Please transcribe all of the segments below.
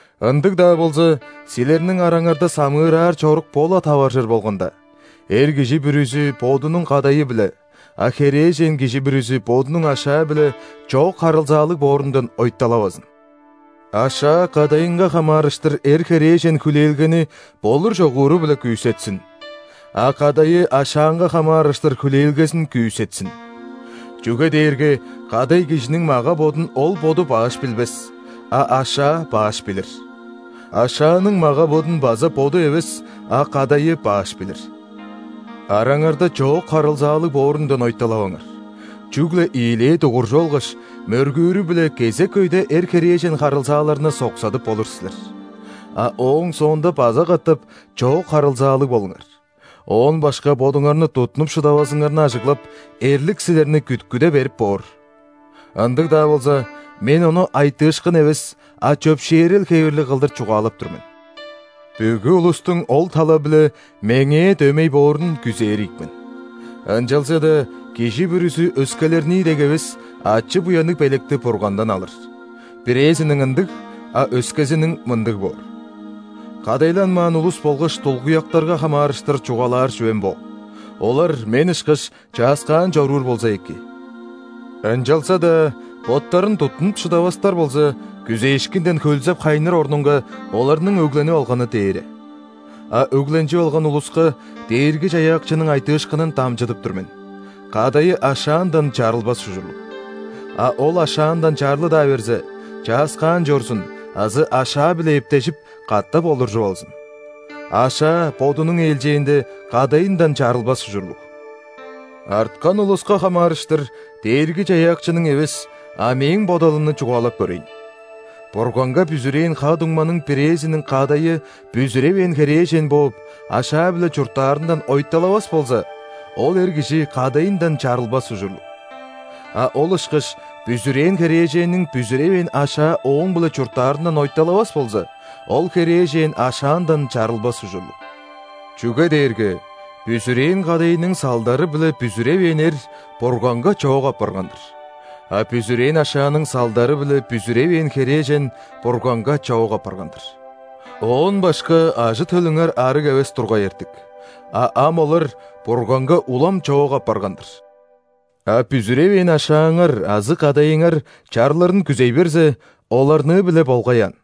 Ындыг-даа болза, силерниң араңарда самыыраар чорук бо-ла таваржыр болганда, эр кижи бүрүзү бодунуң кадайы-биле, а херээжен кижи бүрүзү бодунуң ашаа-биле чоок харылзаалыг боорундан ойталавазын. Ашаа кадайынга хамаарыштыр эр-херээжен хүлээлгени болур-чогууру-биле күүсетсин, а кадайы ашаанга хамаарыштыр хүлээлгезин күүсетсин. Чүге дээрге кадай кижиниң мага-бодун ол боду баш билбес, а ашаа баш билир. Ашааның мага-бодун база боду эвес, а кадайы баш билир. Араңарда чоок харылзаалыг боорундан ойталаваңар, чүгле ийилээ дугуржуп алгаш, мөргүүрү-биле кезек өйде эр-херээжен харылзааларны соксадып болур силер. А ооң соонда база катап чоок харылзаалыг болуңар, оон башка бодуңарны туттунуп шыдавазыңарны ажыглап, эрлик силерни күткүде берип боор. Ындыг-даа болза, мен ону айтыышкын эвес, а чөпшээрел хевирлиг кылдыр чугаалап тур мен. Бүгү улустуң ол тала-биле меңээ дөмей боорун күзээр ийик мен, ынчалза-даа кижи бүрүзү өскелернии дег эвес ачы-буянныг белекти Бургандан алыр: бирээзиниң – ындыг, а өскезиниң – мындыг боор. Кадайланмаан улус болгаш дулгуяктарга хамаарыштыр чугаалаар чүвем бо: олар, мен ышкаш, чааскаан чоруур болза эки. Ынчалза-даа боттарын туттунуп шыдавастар болза, күзээшкинден хөлзеп-хайныр орнунга, оларның өгленип алганы дээре. А өгленчип алган улуска Дээрги-Чаяакчының айтыышкынын дамчыдып тур мен: кадайы ашаандан чарылбас ужурлуг. А ол ашаандан чарлы-даа берзе, чааскаан чорзун азы ашаа-биле эптежип, катап олуржуп алзын. Ашаа, бодунуң ээлчээнде, кадайындан чарылбас ужурлуг. Арткан улуска хамаарыштыр Дээрги-Чаяакчының эвес, а мээң бодалымны чугаалап көрейн: Бурганга бүзүрээн ха-дуңманың бирээзиниң кадайы бүзүревээн херээжен бооп, ашаа-биле чурттаарындан ойталавас болза, ол эр кижи кадайындан чарылбас ужурлуг. А ол ышкаш бүзүрээн херээженниң бүзүревээн ашаа ооң-биле чурттаарындан ойталавас болза, ол херээжен ашаандан чарылбас ужурлуг. Чүге дээрге бүзүрээн кадайының салдары-биле бүзүревээн эр Бурганга чоок апарган-дыр, а бүзүрээн ашааның салдары-биле бүзүревээн херээжен Бурганга чоок апарган-дыр. Оон башка ажы-төлүңер ·арыг эвес тургай эртик, а ам олар Бурганга улам чоок апарган-дыр. А бүзүревээн ашааңар азы кадайыңар чарлырын күзей берзе, оларныы-биле болгай аан.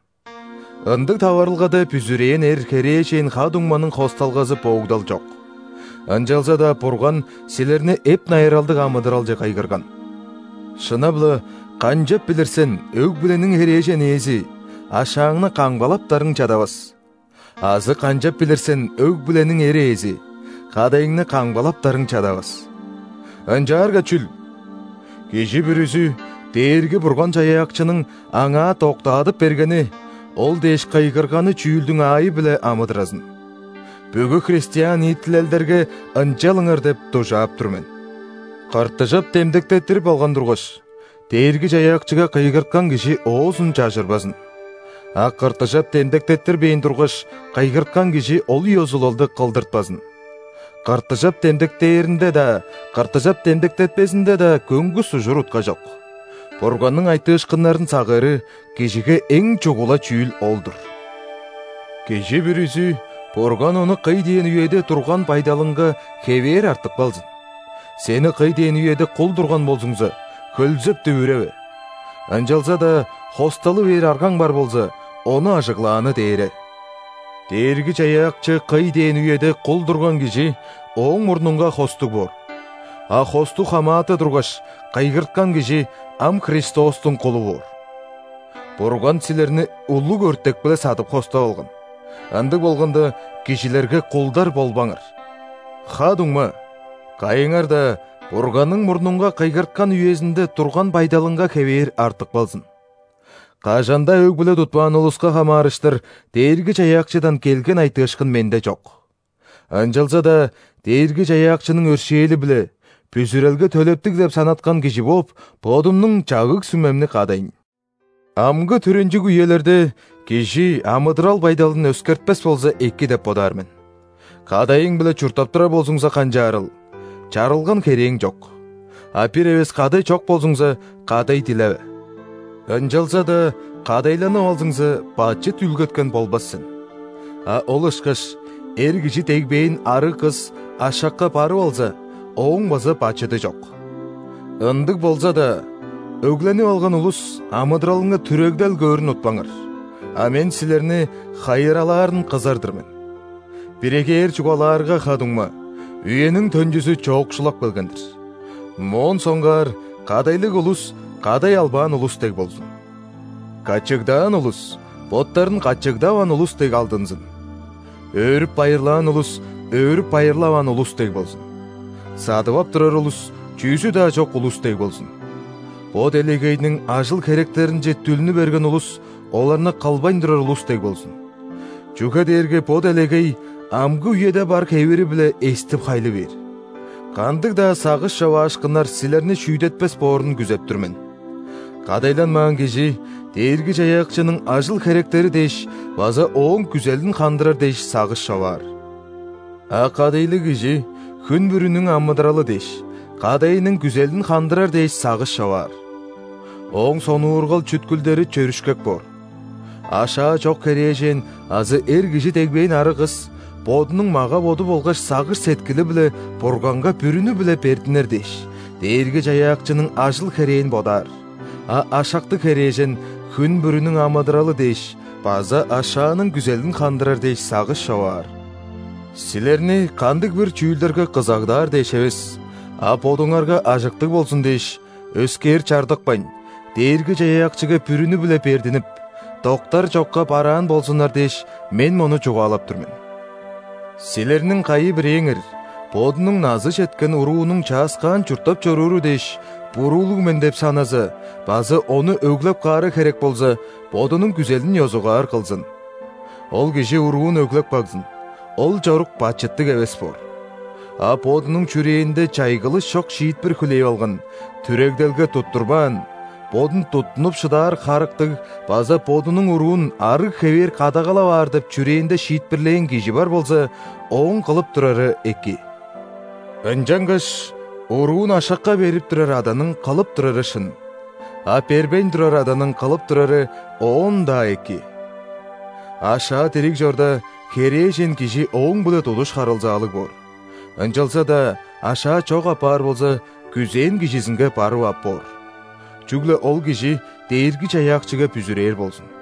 Ындыг таварылгада бүзүрээн эр, херээжен ха-дуңманың хосталгазы боогдал чок. Ынчалза-даа Бурган силерни эп-найыралдыг амыдыралче кыйгырган. Шынап-ла, канчап билир сен, өг-бүлениң херээжен ээзи? Ашааңны камгалаптарың чадавас. Азы канчап билир сен, өг-бүлениң эр ээзи? Кадайыңны камгалаптарың чадавас. Ынчаарга чүл? Кижи бүрүзү Дээрги-Бурган-Чаяакчының аңаа доктаадып бергени, ол дээш кыйгырганы чүүлдүң аайы-биле амыдыразын. Бүгү христиан ниитилелдерге «ынчалыңар» деп дужаап тур мен. Кыртыжап демдектеттирип алган тургаш, Дээрги-Чаяакчыга кыйгырткан кижи оозун чажырбазын. А ·кыртыжап демдектеттирбээн тургаш, кыйгырткан кижи ол ёзулалды кылдыртпазын. Кыртыжап демдектээринде-даа, кыртыжап демдектетпезинде-даа көңгүс ужур-утка чок. Бурганның айтыышкыннарын сагыыры – кижиге эң чугула чүүл ол-дур! Кижи бүрүзү Бурган ону кый дээн үеде турган байдалынга хевээр артып калзын. Сени кый дээн үеде кул турган болзуңза, хөлзеп-дүвүреве. (Ынчалза-даа хосталы бээр аргаң бар болза, ону ажыглааны дээре.) Дээрги-Чаяакчы кый дээн үеде кул турган кижи Ооң мурнунга хостуг боор. А хостуг хамааты тургаш, кыйгырткан кижи ам Христостуң кулу боор. Бурган силерни улуг өртек-биле садып хостап алган, ындыг болганда, кижилерге кулдар болбаңар. Ха-дуңма, кайыңар-даа Бурганның мурнунга кыйгырткан үезинде турган байдалынга хевээр артып калзын. Кажан-даа өг-бүле тутпаан улуска хамаарыштыр Дээрги-Чаяакчыдан келген айтыышкын менде чок. Ынчалза-даа Дээрги-Чаяакчының өршээли-биле бүзүрелге төлептиг деп санаткан кижи бооп, бодумнуң чагыг-сүмемни кадайн. Амгы түренчиг үелерде кижи амыдырал байдалын өскертпес болза эки деп бодаар мен. Кадайың-биле чурттап турар болзуңза, канчаарыл? Чарылган херээң чок. А бир эвес кадай чок болзуңза, кадай дилеве. Ынчалза-даа кадайланып алзыңза, бачыт үүлгеткен болбас сен. А ол ышкаш эр кижи дегбээн арыг кыс ашакка барып алза, ооң база бачыды чок. Ындыг болза-даа, өгленип алган улус амыдыралынга түрегдел көөрүн утпаңар, а мен силерни хайыралаарын кызар-дыр мен. Биригээр чугаалаарга, ха-дуңма, үениң төнчүзү чоокшулап келген-дир. Моон соңгаар кадайлыг улус кадай албаан улус дег болзун. Качыгдаан улус боттарын качыгдаваан улус дег алдынзын. Өөрүп-байырлаан улус өөрүп-байырлаваан улус дег болзун. Садып ап турар улус чүзү-даа чок улус дег болзун. Бо делегейниң ажыл-херектеринче дүлнү берген улус оларны кылбайн турар улус дег болзун. Чүге дээрге бо делегей амгы үеде бар хевири-биле эстип-хайлы бээр. Кандыг-даа сагыш човаашкыннар силерни шүүдетпес боорун күзеп тур мен. Кадайланмаан кижи Дээрги-Чаяакчының ажыл-херектери дээш база Ооң күзелин хандырар дээш сагыш човаар. А кадайлыг кижи хүн бүрүнүң амыдыралы дээш, кадайының күзелин хандырар дээш сагыш човаар. Ооң сонуургал-чүткүлдери чөрүшкек боор. Ашаа чок херээжен азы эр кижи дегбээн арыг кыс, бодунуң мага-боду болгаш сагыш-сеткили-биле Бурганга бүрүнү-биле бердинер дээш, Дээрги-Чаяакчының ажыл-херээн бодаар, а ашактыг херээжен хүн бүрүнүң амыдыралы дээш база ашааның күзелин хандырар дээш сагыш човаар. Силерни кандыг-бир чүүлдерге кызагдаар дээш эвес, а бодуңарга ажыктыг болзун дээш; өскээр чардыкпайн, Дээрги-Чаяакчыга бүрүнү-биле бердинип, доктар чокка бараан болзуннар дээш, мен мону чугаалап тур мен. Силерниң кайы-бирээңер бодунуң назы четкен уруунуң чааскаан чурттап чорууру дээш, буруулуг мен деп саназа база ону өглеп каары херек болза, бодунуң күзелин ёзугаар кылзын. Ол кижи уруун өглеп кагзын, ол чорук бачыттыг эвес боор. А бодунуң чүрээнде чайгылыш чок шиитпир хүлээп алган, түрегделге туттурбаан, бодун туттунуп шыдаар харыктыг база бодунуң уруун арыг хевээр кадагалап аар деп чүрээнде шиитпирлээн кижи бар болза, ооң кылып турары эки. Ынчангаш уруун ашакка берип турар аданың кылып турары шын, а бербейн турар аданың кылып турары оон-даа эки. Ашаа дириг чорда, херээжен кижи ооң-биле тудуш харылзаалыг боор, ынчалза-даа ашаа чок апаар болза, күзээн кижизинге барып ап боор. Чүгле ол кижи Дээрги-Чаяакчыга бүзүрээр болзун.